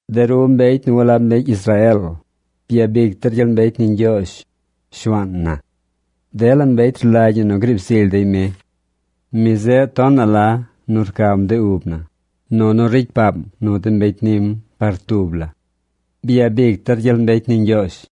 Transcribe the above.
De ru mbecy nu walab mbecy Israeel, byabic der gyel mbecy ni Ñgyoozh, Shuaan na. Dela mbecy rlagy ñi nu griib zily dey mi. Mi zeꞌ tonaꞌ la nu rcam de ub na, nunu ricy paam nu de mbecy nim par tub la. ¡Byabic der gyel mbecy ni Ñgyoozh!